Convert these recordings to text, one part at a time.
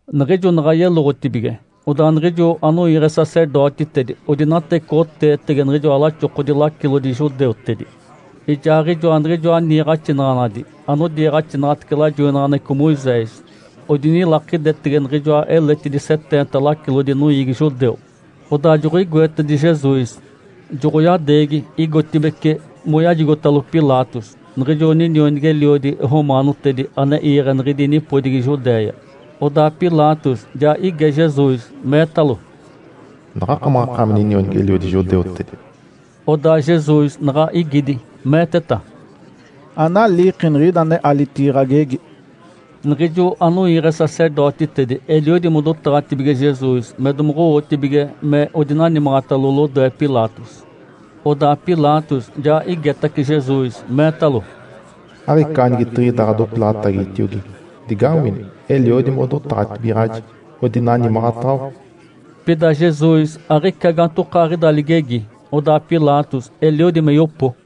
Niɡ̶ijo naɡ̶a yeloɡ̶otibige, odaa niɡ̶ijo anoiiɡ̶e sacerdotitedi odinatecoɡ̶oteetege niɡ̶ijoa laxokodi lacilodi judeutedi ijaaɡ̶ijoa niɡ̶ijoa niiɡ̶axinaɡ̶anadi anodiiɡ̶axinaɡ̶atece lajoinaɡ̶aneɡ̶eco Moisés. Odinilakidetege niɡ̶ijoa eletidi seteenta lacilodi noiigi judeu. Odaa joɡ̶oigoetedi Jesus, joɡ̶oyadeegi igotibeci moyajigotalo Pilatos, niɡ̶ijo ninionigi-eliodi romaanotedi ane iiɡ̶e niɡ̶idi nipodigi Judéia. Odaa Pilatos ja ige Jesus, meetalo, “Naɡ̶akamaɡ̶akaami ninionigi-eliodi judeutedi?” Odaa Jesus naɡ̶a igidi, meeteta, “Analiiki niɡ̶ida ane alitigi ɡ̶agegi.” Niɡ̶ijo anoiiɡ̶e sacerdotitedi eliodi modotaɡ̶atibige Jesus me domoɡ̶owotibige me odinanimaɡ̶atalo lodoe Pilatos. Odaa Pilatos ja igetace Jesus, meetalo, “Aɡ̶ica anigetiɡ̶ida ɡ̶adopilaɡ̶atagitiogi? Digawini, eliodi modotaɡ̶atibigaɡ̶aji, odinanimaɡ̶ataɡ̶awa.” Pida Jesus aɡ̶ica gaantokaaɡ̶ida ligegi, odaa Pilatos eliodi me yopo.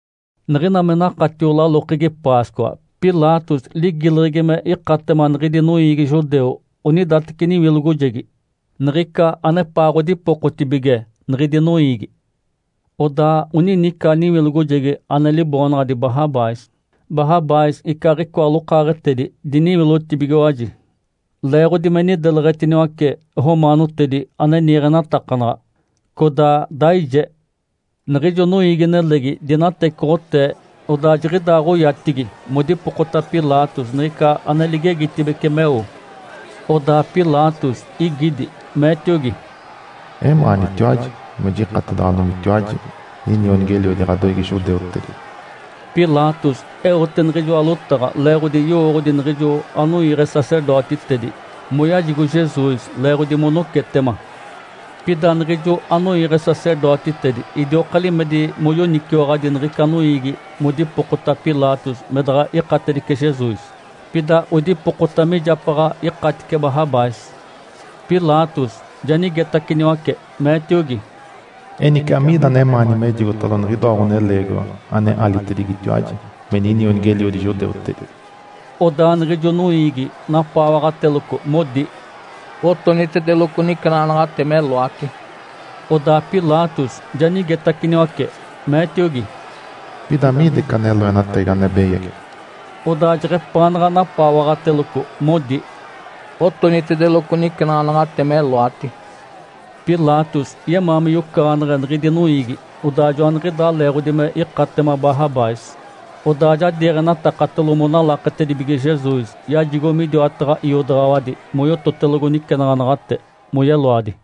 Niɡ̶ina me nakatio lalokegi Páscoa, Pilatos ligileɡ̶egi me ikatema niɡ̶idi noiigi judeu onidateci niwilogojegi, niɡ̶ica anepaaɡ̶odipokotibige niɡ̶idi noiigi. Odaa onini ica niwilogojegi ane liboonaɡ̶adi Barrabás. Barrabás icaaɡ̶icoa lokaaɡ̶etedi diniwilotibigiwaji leeɡ̶odi me nideleɡ̶etiniwace romaanotedi ane niiɡ̶enatakanaɡ̶a, codaa daije. Niɡ̶ijo noiigi-nelegi dinatecoɡ̶otee, odaa jiɡ̶idaaɡ̶oyatigi modipokota Pilatos niɡ̶ica ane ligileɡ̶egitibece meo. Odaa Pilatos igidi, meetiogi, “Emaanitiwaji me jikatedaɡ̶adomitiwaji ninionigi-eliodi ɡ̶adoiigi judeutedi?” Pilatos eote niɡ̶ijoa lotaɡ̶a leeɡ̶odi yowooɡ̶odi niɡ̶ijo anoiiɡ̶e sacerdotitedi moyajigo Jesus leeɡ̶odi monocetema. Pida niɡ̶ijo anoiiɡ̶e sacerdotitedi idioka limedi moyoniciwaɡ̶adi niɡ̶ica noiigi modipokota Pilatos me daɡ̶a ikatedice Jesus, pida odipokota mijapaɡ̶a ikatice Barrabás. Pilatos ja nigetaciniwace, meetiogi, “Enice, amiida anemaani mejigotalo niɡ̶idoa ɡ̶oneleegiwa ane alitedigitiwaji me ‘Ninionigi-eliodi judeutedi’?” Odaa niɡ̶ijo noiigi napaawaɡ̶ateloco, modi, “Otonitedeloco nicenaɡ̶anaɡ̶ate meloati!” Odaa Pilatos ja nigetaciniwace, meetiogi, “Pida amiida ica loenatagi ane beyagi?” Odaa jeɡ̶epaanaɡ̶a napaawaɡ̶ateloco, modi, “Otonitedeloco nicenaɡ̶anaɡ̶ate meloati!” Pilatos yemaa me yocaɡ̶aneɡ̶e niɡ̶idi noiigi. Odaa joaniɡ̶idaa leeɡ̶odi me ikatema Barrabás, odaa ja diiɡ̶enatakatalo monalaketedibige Jesus, yajigo midiwataɡ̶a iodaɡ̶awadi moyototedeloco nicenaɡ̶anaɡ̶ate moyeloadi.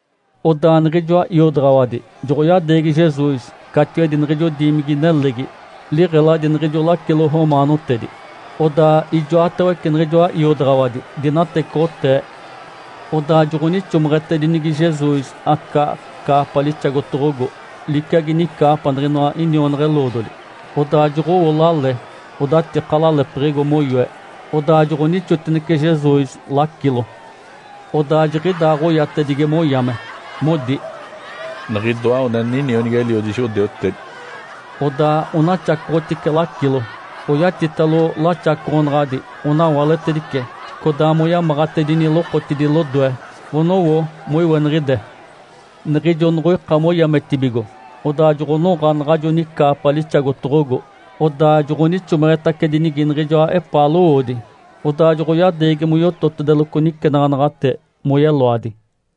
Odaa niɡ̶ijoa iodaɡ̶awadi joɡ̶oyadeegi Jesus catiwedi niɡ̶ijo diimigi-nelegi, liɡ̶eladi niɡ̶ijo lacilo romaanotedi, odaa ijoatawece niɡ̶ijoa iodaɡ̶awadi dinatecoɡ̶otee. Odaa joɡ̶onixomeɡ̶etedinigi Jesus aca caapa lixagotoɡ̶ogo, liciagi nicaapa niɡ̶inoa inionaɡ̶a-eloodoli. Odaa joɡ̶owo lale odatika lalepiɡ̶igo moyoe, odaa joɡ̶onixotinece Jesus lacilo. Odaa jiɡ̶idaaɡ̶oyatedigi moyame, modi, “Niɡ̶idoa ninionigi-eliodi judeutedi!” Odaa onaxacoɡ̶otice lacilo, oyatitalo laxacoɡ̶onaɡ̶adi, onawaletedice, codaa moyamaɡ̶atedini lokotidi lodoe, onowo moiweniɡ̶ide. Niɡ̶ijo noɡ̶oika moyametibigo, odaa joɡ̶onoɡ̶a naɡ̶ajo nicaapa lixagotoɡ̶ogo, odaa joɡ̶onixomeɡ̶etacedinigi niɡ̶ijoa epaa lowoodi. Odaa joɡ̶oyadeegi moyototedeloco nicenaɡ̶anaɡ̶ate moyeloadi.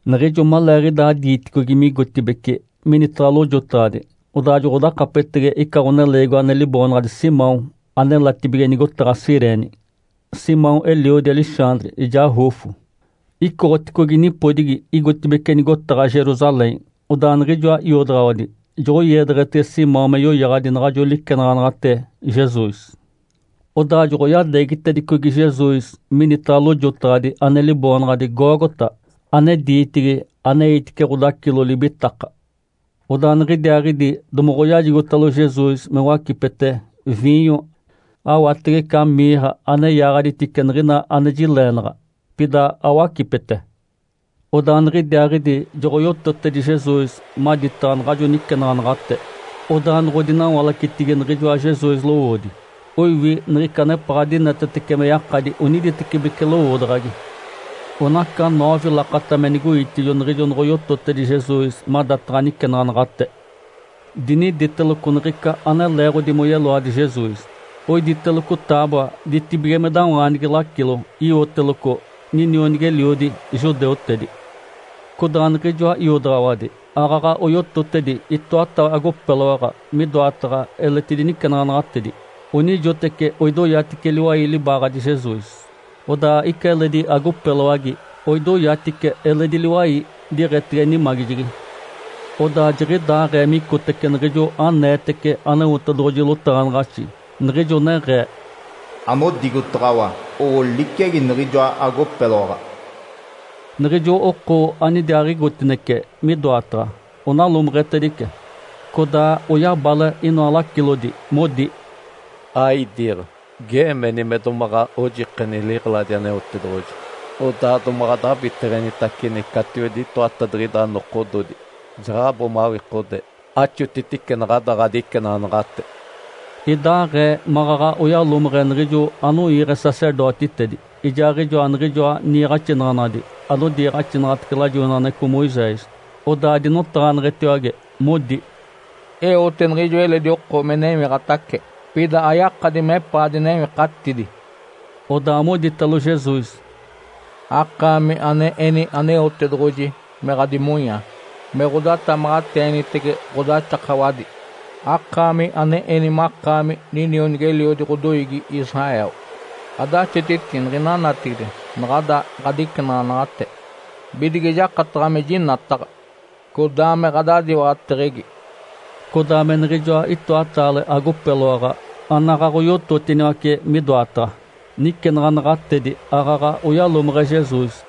Niɡ̶ijo maleeɡ̶idaa diiticogi migotibeci minitaɡ̶a lojotaɡ̶adi, odaa joɡ̶odakapetege ica ɡ̶oneleegiwa ane liboonaɡ̶adi Simão anelatibige nigotaɡ̶a Cirene. Simão eliodi Alexandre ijaa Rufo, icoɡ̶oticogi nipodigi, igotibeci nigotaɡ̶a Jerusalém. Odaa niɡ̶ijoa iodaɡ̶awadi joɡ̶oiedeɡ̶etege Simão me yoyaɡ̶adi naɡ̶ajo licenaɡ̶anaɡ̶ate Jesus. Odaa joɡ̶oyadeegitedicogi Jesus minitaɡ̶a lojotaɡ̶adi ane liboonaɡ̶adi Gólgota (ane diitigi “Aneitice ɡ̶odacilo libitaka”.) Odaa niɡ̶idiaaɡ̶idi domoɡ̶oyajigotalo Jesus me wacipete viinyo awatege ica mirra ane yaaɡ̶aditice niɡ̶ina ane jileenaɡ̶a, pida awacipete. Odaa niɡ̶idiaaɡ̶idi joɡ̶oyototedi Jesus maditaɡ̶a naɡ̶ajo nicenaɡ̶anaɡ̶ate. Odaa noɡ̶odinawalacetigi niɡ̶ijoa Jesus lowoodi, oiwi niɡ̶ica anepaɡ̶a dinetetece me yakadi oniditecibeci lowoodaɡ̶agi. Onaca noove lakata me nigoitijo niɡ̶ijo noɡ̶oyototedi Jesus madataɡ̶a nicenaɡ̶anaɡ̶ate. Diniditeloco niɡ̶ica ane leeɡ̶odi moyeloadi Jesus, oiditeloco taaboa ditibigimedawaanigi lacilo, iwoteloco, “NINIONIGI-ELIODI JUDEUTEDI.” Codaa niɡ̶ijoa iodaɡ̶awadi aaɡ̶aɡ̶a oyototedi itoata agopeloaɡ̶a midoataɡ̶a eletidi nicenaɡ̶anaɡ̶atedi. Onijoteci oidoyatice liwai libaaɡ̶adi Jesus, odaa ica eledi agopeloagi oidoyatice eledi liwai diɡ̶etege nimagijegi. Odaa jiɡ̶idaaɡ̶ee micotece niɡ̶ijo aneetece Aneotedoɡ̶oji lotaɡ̶anaɡ̶axi, niɡ̶ijo neɡ̶ee, “Anodigotaɡ̶awa owo liciagi niɡ̶ijoa agopeloaɡ̶a.” Niɡ̶ijo oko anidiaaɡ̶igotinece midoataɡ̶a onalomeɡ̶etedice. Codaa oyabale inoa lacilodi, modi, “Aidiiɡ̶a! Geemeni me domaɡ̶a ojikeni liɡ̶eladi Aneotedoɡ̶oji, odaa domaɡ̶a adabiteɡ̶enitacini catiwedi itoatadiɡ̶ida nokododi. Jaɡ̶abo mawikodee, axotitice naɡ̶ada ɡ̶adicenaɡ̶anaɡ̶ate!” Idaaɡ̶ee maɡ̶aɡ̶a oyalomeɡ̶e niɡ̶ijo anoiiɡ̶e sacerdotitedi, ijaaɡ̶ijoa niɡ̶ijoa niiɡ̶axinaɡ̶anadi anodiiɡ̶axinaɡ̶atece lajoinaɡ̶aneɡ̶eco Moisés. Odaa dinotaɡ̶aneɡ̶etiwage, modi, “Eote niɡ̶ijo eledi oko me newiɡ̶atace, pida ayakadi mepaa dinewikatidi.” Odaa moditalo Jesus, “Akaami ane eni Aneotedoɡ̶oji me ɡ̶adimonyaa me ɡ̶odatamaɡ̶ateenitege ɡ̶odaxakawadi, akaami ane eni makaami ninionigi-eliodi ɡ̶odoiigi Israel, adaxotiti niɡ̶ina natigide naɡ̶ada ɡ̶adicenaɡ̶anaɡ̶ate bidige jakataɡ̶a me jinataɡ̶a, codaa me ɡ̶adadiwaɡ̶ateɡ̶egi!” Codaa me niɡ̶ijoa itoataale agopeloaɡ̶a anaɡ̶aɡ̶oyototiniwace midoataɡ̶a nicenaɡ̶anaɡ̶atedi aaɡ̶aɡ̶a oyalomeɡ̶e Jesus.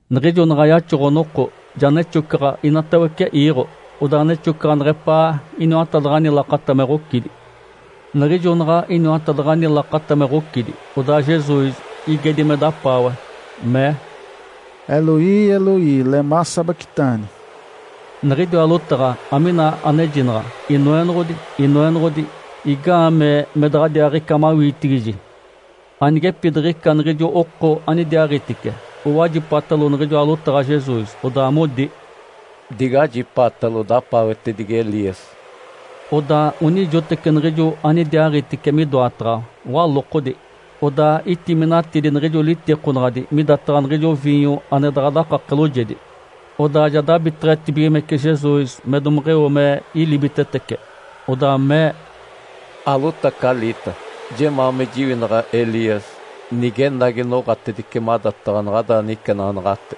Niɡ̶ijo naɡ̶a yaxoɡ̶o-noko, ja nexocaɡ̶a inatawece iiɡ̶o, odaa nexocaɡ̶a neɡ̶epaa iniwatadaɡ̶ani lakata me ɡ̶ocidi. Niɡ̶ijo naɡ̶a iniwatadaɡ̶ani lakata me ɡ̶ocidi, odaa Jesus igedi me dapaawe, mee, “Eloí, Eloí, lemá sabactani?” (Niɡ̶idiwa lotaɡ̶a amina anejinaɡ̶a “Inoenoɡ̶odi, Inoenoɡ̶odi, igaamee me daɡ̶adiaaɡ̶ica mawiitigiji?”) Anigepidiɡ̶ica niɡ̶ijo oko anidiaaɡ̶itice owajipatalo niɡ̶ijoa lotaɡ̶a Jesus, odaa modi, “Digajipaatalo! Dapaawetedigi Elias!” Odaa onijoteci niɡ̶ijo anidiaaɡ̶itice midoataɡ̶a walokodi, odaa itiminatidi niɡ̶ijo litikonaɡ̶anaɡ̶adi midataɡ̶a niɡ̶ijo viinyo ane daɡ̶a dakake loojedi. Odaa ja dabiteɡ̶etibigimece Jesus me domeɡ̶eo me ilibitetece. Odaa mee, “Alotacaliita! Jemaa me jiwinaɡ̶a Elias nigenagi noɡ̶atedice madataɡ̶a naɡ̶ada nicenaɡ̶anaɡ̶ate.”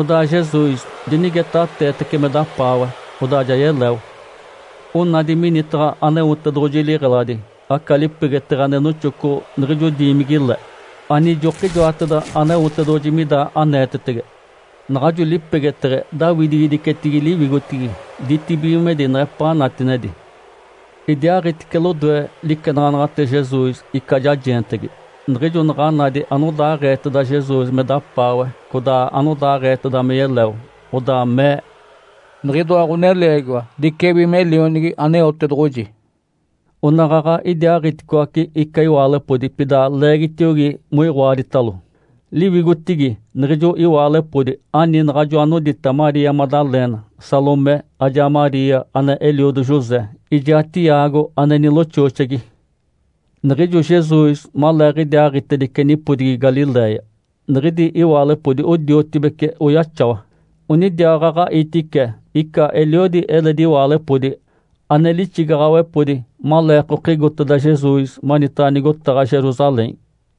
Odaa Jesus dinigetaɡ̶ateetace me dapaawe, odaa ja yeleo. Onada minitaɡ̶a Aneotedoɡ̶oji liɡ̶eladi aca lipegeteɡ̶e ane noxoco niɡ̶ijo diimigi-le ane ijokijoateda Aneotedoɡ̶oji mida aneetetege. Naɡ̶ajo lipegeteɡ̶e daawidigidicetigi liwigotigi ditibigimedi neɡ̶epaa natinedi. Idiaaɡ̶itice lodoe licenaɡ̶anaɡ̶ate Jesus ica jajeentegi. Niɡ̶ijo naɡ̶a nadi anodaaɡ̶eeteda Jesus me dapaawe codaa anodaaɡ̶eeteda me yeleo, odaa mee, “Niɡ̶idoa ɡ̶oneleegiwa dicewi me Lionigi Aneotedoɡ̶oji.” Onaɡ̶aɡ̶a idiaaɡ̶iticoaci ica iwaalepodi pida leegitiogi moiɡ̶oaditalo. Liwigotigi niɡ̶ijo iwaalepodi ani naɡ̶ajo anodita Maria Madalena, Salomé, ajaa Maria ane eliodo José, ijaa Tiago ane niloxooxegi. Niɡ̶ijo Jesus maleeɡ̶idiaaɡ̶itedice nipodigi Galiléia, niɡ̶idi iwaalepodi odiotibece oyaxawa. Onidiaaɡ̶aɡ̶a itice ica eliodi eledi iwaalepodi ane lixigaɡ̶awepodi maleekokigoteda Jesus manitaɡ̶a nigotaɡ̶a Jerusalém.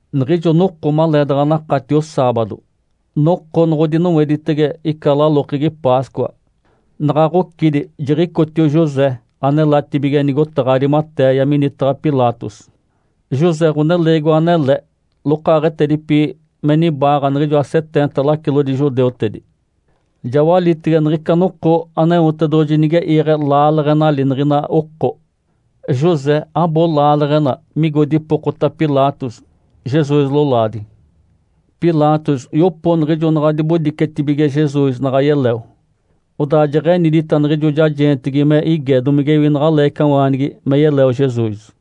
Niɡ̶ijo noko maleedaɡ̶a nakatio saabado, noko noɡ̶odinoweditege ica lalokegi Páscoa. Naɡ̶a ɡ̶ocidi, jiɡ̶icotio José anelatibige nigotaɡ̶a Arimatéia minitaɡ̶a Pilatos. José ɡ̶oneleegiwa anele, lokaaɡ̶etedipi me nibaaɡ̶a niɡ̶ijoa seteenta lacilodi judeutedi. Ja walitege niɡ̶ica noko Aneotedoɡ̶oji nige iiɡ̶e laaleɡ̶enali niɡ̶ina oko. José abo laaleɡ̶ena migo dipokota Pilatos Jesus lolaadi. Pilatos yopo niɡ̶ijo naɡ̶a dibodicetibige Jesus naɡ̶a yeleo. Odaa jeɡ̶enidita niɡ̶ijo jajeentegi me ige domigewi naɡ̶a leecawaanigi me yeleo Jesus.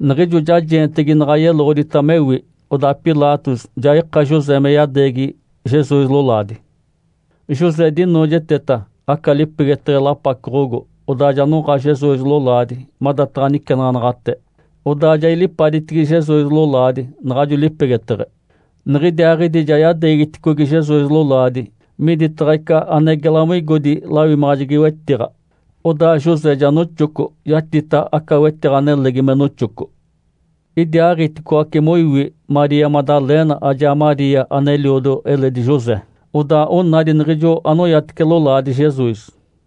Niɡ̶ijo jajeentegi naɡ̶a yeloɡ̶odita mewi, odaa Pilatos ja ika José me yadeegi Jesus lolaadi. José dinoojeteta aca lipegeteɡ̶e lapacoɡ̶ogo, odaa ja noɡ̶a Jesus lolaadi madataɡ̶a nicenaɡ̶anaɡ̶ate, odaa ja ilipaditigi Jesus lolaadi naɡ̶ajo lipegeteɡ̶e. Niɡ̶idiaaɡ̶idi ja yadeegiticogi Jesus lolaadi midataɡ̶a ica ane gela moigodi lawimaɡ̶ajegi-wetiɡ̶a. Odaa José ja noxoco yatita aca wetiɡ̶a nelegi me noxoco. Idiaaɡ̶iticoaci moiwi Maria Madalena ajaa Maria ane eliodo eledi José. Odaa onadi niɡ̶ijo anoyatice lolaadi Jesus.